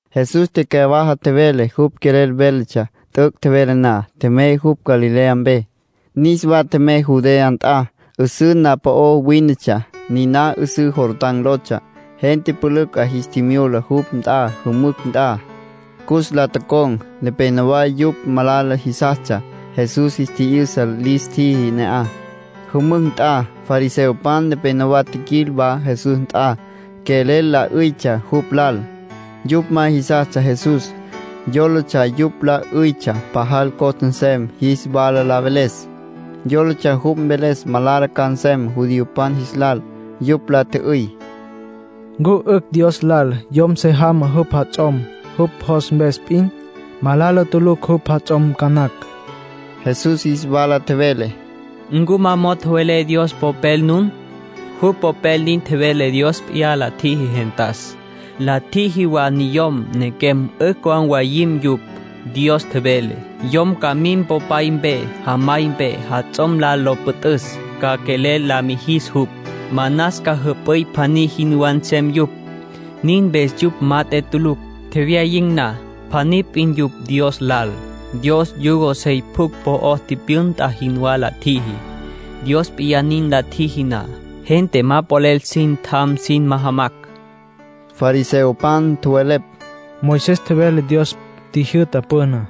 Jesús tecyawaja tjevele jupj quelel véletsja. T'üc' tjevele na, tjemey jupj Galilea mpe. Niswa tjemey Judea nt'a. 'Üsǘ na'aj po'ó wínetsja. Niná 'üsǘ Jordán lotsja. Gente pülücj 'a jis tjimyula jupj nt'a jümücj nt'a, cus la con̈. Nepénowa yupj malala jisastsja. Jesús jis tji'yü'sa lis tjiji ne'aj, jümücj nt'a. Fariseopan nepenowá tjiquil wa Jesús nt'a. Quelel la 'üytsja jupj lal. Yupj ma jisastsja Jesús. Yólatsja yupj la 'üytsja pajal costa nsem jis wala la veles. Yólatsja jupj mveles malala ca nsem judiopan jis lal. Yupj la tjü'üy: —¿Ncu 'ücj Dios lal yom se jamá jupj jats'om, jupj jos mpes p'in? Malala tulucj jupj jats'om ca nacj. Jesús jis wala tjevele: —¿Ncu ma mo'o tjowelé Dios Popel nun? Jupj Popel nin vele Dios p'iyá la tjiji gentas. ‘La tjiji wa niyom, nequem, 'ücj ca mwayin̈ yupj.’ Dios tjevele: ‘Yom ca mim popay mpe, jamay mpe, jats'om lal lo püt'üs. Ca quelel la mijis jupj. Manas ca jüp'üy pjaní jinwá nsem yupj.’ Nin mpes yupj mat'e tulucj, tjewyayin̈ na. Pjaní p'in yupj Dios lal. Dios yugo sey pjucj po'ó tipyünta jinwá la tjiji. Dios p'iyá nin la tjiji na, gente ma polel sin tjan sin majamacj —nin tjevele Jesús. Fariseopan tjowelepj: —Moisés tjevele Dios tjijyü'ta püná.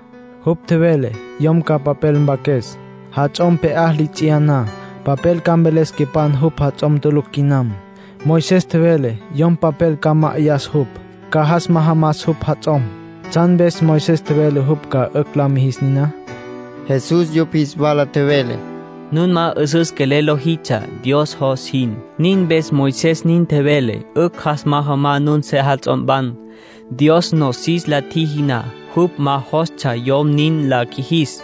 Jupj tjevele yom ca papel mpaques, jats'om pje'á li ts'iyá na. Papel ca mveles quepan jupj jats'om tulucj quinam. Moisés tjevele yom papel ca ma'ayas jupj, ca jas majamas jupj jats'om. ¿Tsjan mpes Moisés tjevele jupj ca 'ücj la mijis niná? Jesús yupj jis wala tjevele: —Nun ma 'üsüs quelel lojitsja, Dios jos jin. Nin mpes Moisés nin tjevele 'ücj jas majamá nun sejats'ompan. Dios nosis la tjiji na, jupj ma jostsja yom nin la qjuijis.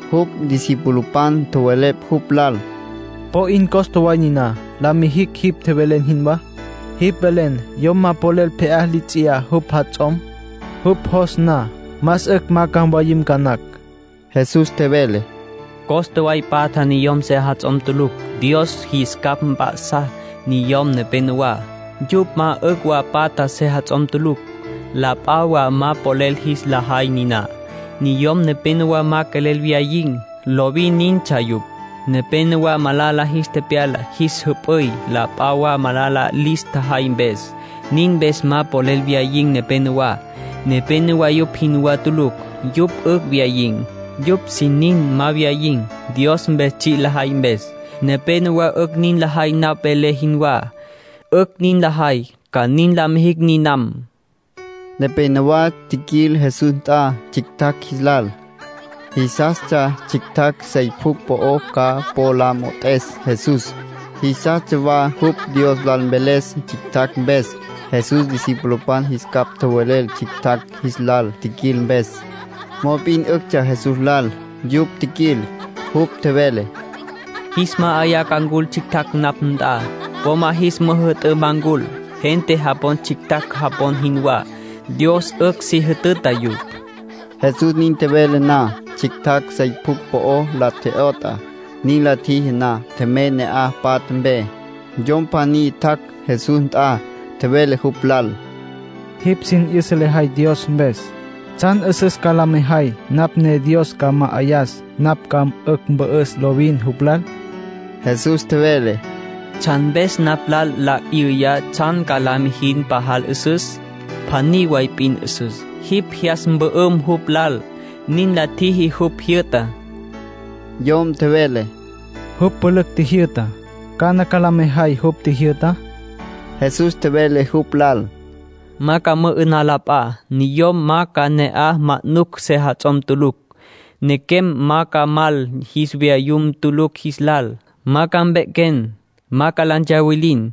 Jupj discipulopan tjowelepj jupj lal: —Po 'in costa way niná la mijicj jipj tjevelen jinwá. Jipj velen yom ma polel pje'á li ts'iyá jupj jats'om, jupj jos na. Más 'ücj ma ca mwayim ca nacj. Jesús tjevele: —Costa way patja niyom sejats'om tulucj. Dios jis capj p'ya'sa niyom nepenowá. Yupj 'ücj wa patja sejats'om tulucj. La p'a wa ma polel jis la jay niná. Niyom nepenowá ma quelel wyayin̈. Lovin nintsja yupj. Nepénowa malala jis tepyala jis jüp'üy, la p'a wa malala lis tjajay mpes, nin mpes ma polel wyayin̈ nepenowá. Nepénowa yupj jinwá tulucj. Yupj 'ücj wyayin̈. Yupj sin nin ma wyayin̈, Dios mpes tsji' lajay mpes. Nepénowa 'ücj nin lajay napj velé jinwá. 'Ücj nin lajay, ca nin la mijicj ninam —nin tjevele Jesús. Nepénowa tjiquil Jesús nt'a tsjictjacj jis lal. Jisastsja tsjictjacj sey pjucj po'ó ca po la mo'ot'es Jesús. Jisastsja wa jupj Dios lal mveles tsjictjacj mpes. Jesús discipulopan jis capj tjowelel tsjictjacj jis lal tjiquil mpes. Mop'in 'üctsja Jesús lal yupj tjiquil. Jupj tjevele: “Jis ma'ayá ca ncul tsjictjacj napj nt'a. Po ma jis müjü'tǘ ma ncul. Gente japon tsjictjacj japon jinwá, Dios 'ücj si jütüta yupj.” Jesús nin tjevele na, tsjictjacj sey pjucj po la tje'yot'a. Nin la tjiji na, tjemey ne'aj patja mpe. Yom pjaní tjac' Jesús nt'a. Tjevele jupj lal: —Jipj sin 'yüsa lejay Dios mpes. ¿Tsjan 'üsüs ca la mejay napj ne Dios ca ma'ayas napj ca 'ücj mpü'üs lovin jupj lal? Jesús tjevele: —¿Tsjan mpes napj lal nla 'yüy tsjan ca la mijin pajal 'üsüs? Pjaní way p'in 'üsüs. Jipj jyas mpü'üm jupj lal, nin la mijin jupj jyü'tá. Yom tjevele: —Jupj pülücj tjijyü'ta. ¿Cana ca la mejay jupj tjijyü'tá? Jesús tjevele jupj lal: —‘Ma ca mü'ü'nan la p'a. Niyom ma ca ne'aj manucj sejats'om tulucj. Nequem ma ca mal jis vayum tulucj jis lal. Ma ca mpequem. Ma la ntsawilin.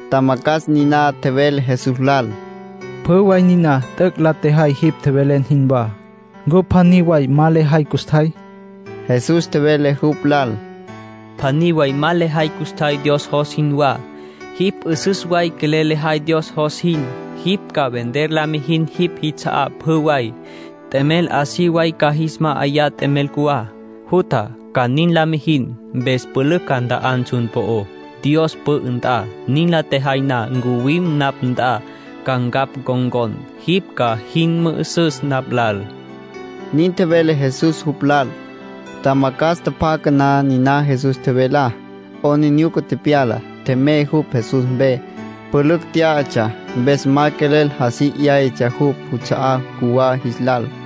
Tjamacjas niná tjevele Jesús lal: —Pjü way niná t'üc' la tjejay jipj tjevelen jinwá. ¿Ncu pjaní way ma lejay custjay? Jesús tjevele jupj lal: —Pjaní way ma lejay custjay Dios jos jinwá. Jipj 'üsüs way quelel lejay Dios jos jin, jipj ca vender la mijin jipj jits'a'á pjü way. T'emel así way ca jis ma'ayan t'emel cjuwá. Jutja, ca nin la mijin. Mpes pülücj ca nt'an tsjun po'ó, Dios pü'ü nt'a. Nin la tjejay na, ncuwim napj nt'a, ca ncapj ncon̈con. Jipj ca jin mü'üsüs napj lal —nin tjevele Jesús jupj lal. Tjamacjas tjapjaca na niná Jesús tjevelá, 'aplijila tepyala. Tjemey jupj Jesús mpe. Pülücj tyá'atsja, mpes ma quelel así 'yáyatsja jupj juts'a'á cjuwá jis lal.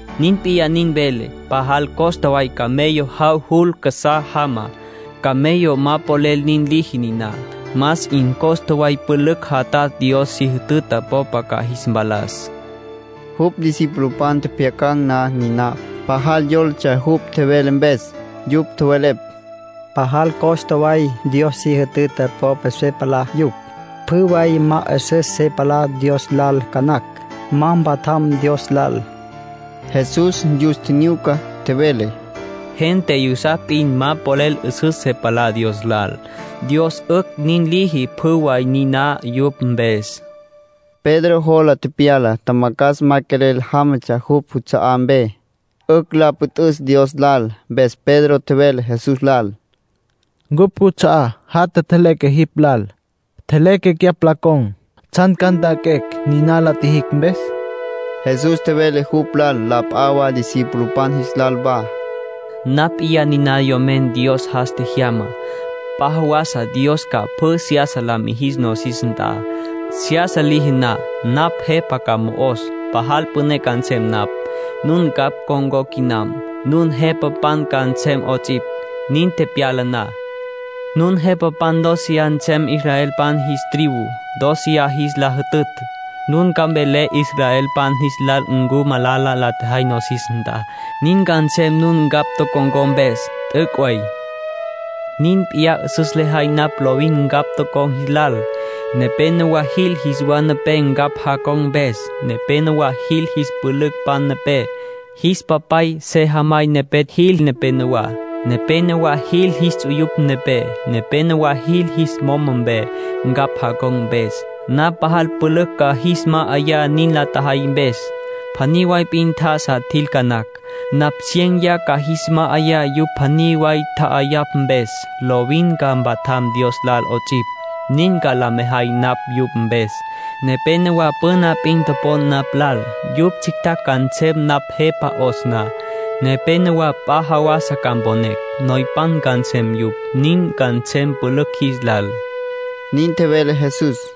Nin p'iyá nin velé. Pajal costa way camello jav jul casá jama. Camello ma polel nin liji niná. Más 'in costa way pülücj jatatj Dios si jütüta popa ca jis mpalas —nin tjevele Jesús. Jupj discipulopan tjepjyacan̈ na niná, pajal yólatsja jupj tjevele mpes. Yupj tjowelepj: “Pajal costa way Dios si jütüta popa se palá yupj. Pjü way ma 'üsüs se palá Dios lal ca nacj, ma mpatjam Dios lal.” Jesús yus tjinyuca, tjevele: —Gente yusapj p'in ma polel 'üsüs se palá Dios lal. Dios 'ücj nin liji pjü way niná yupj mpes —tjevele. Pedro jola tepyala tjamacjas ma quelel jámatsja jupj juts'a'á mpe, 'ücj la püt'üs Dios lal. Mpes Pedro tjevele Jesús lal: —Ncupj cuts'a'á jatja tjeleque jipj lal. Tjeleque cyapj la con̈. ¿Tsjan ca nt'anquecj niná la tjijicj mpes? Jesús tjevele jupj lal, la p'a wa discipulopan jis lal wa: —Napj p'iyá niná Yomen Dios jas tjejyamá. P'a jawasa Dios ca pjü seyasa la mijis nosis nt'a. Seyasa liji na, napj Jepa ca mo'os. Pajal püné ca nsem napj. Nun ncapj con̈có quinam, nun jepapan ca nsem 'ots'ipj, nin tepyala na. Nun jepapan dóceya nsem, israelpan jis tribu dóceya jis la jütütj. Nun ca mvelé israelpan jis lal ncu malala la tjajay nosis nt'a. Nin ca nsem nun ncapj tocon̈có mpes. T'üc' way. Nin p'iyá 'üsüs lejay napj lovin ncapj tocon̈ jis lal. Nepénowa jil jis wa nepé ncapj jacon̈ mpes. Nepénowa jil jis pülücpan nepé. Jis papay, sejamay nepé jil nepenowá. Nepénowa jil jis ts'uyupan nepé. Nepénowa jil jis moma mpe, ncapj jacon̈ mpes. Napj pajal pülücj ca jis ma'ayá nin la tjajay mpes. Pjaní way p'in tjá'asa tjil ca nacj. Napj ciéneya ca jis ma'ayá yupj pjaní way tja'ayapj mpes. Lovin ca mpatjam Dios lal 'ots'ipj, nin ca la mejay napj yupj mpes. Nepénowa püna p'in topon napj lal, yupj tsjictjacj ca nsem napj Jepa 'os na. Nepénowa p'a jawasa ca mponecj, noypan ca nsem yupj. Nin ca nsem pülücj jis lal —nin tjevele Jesús.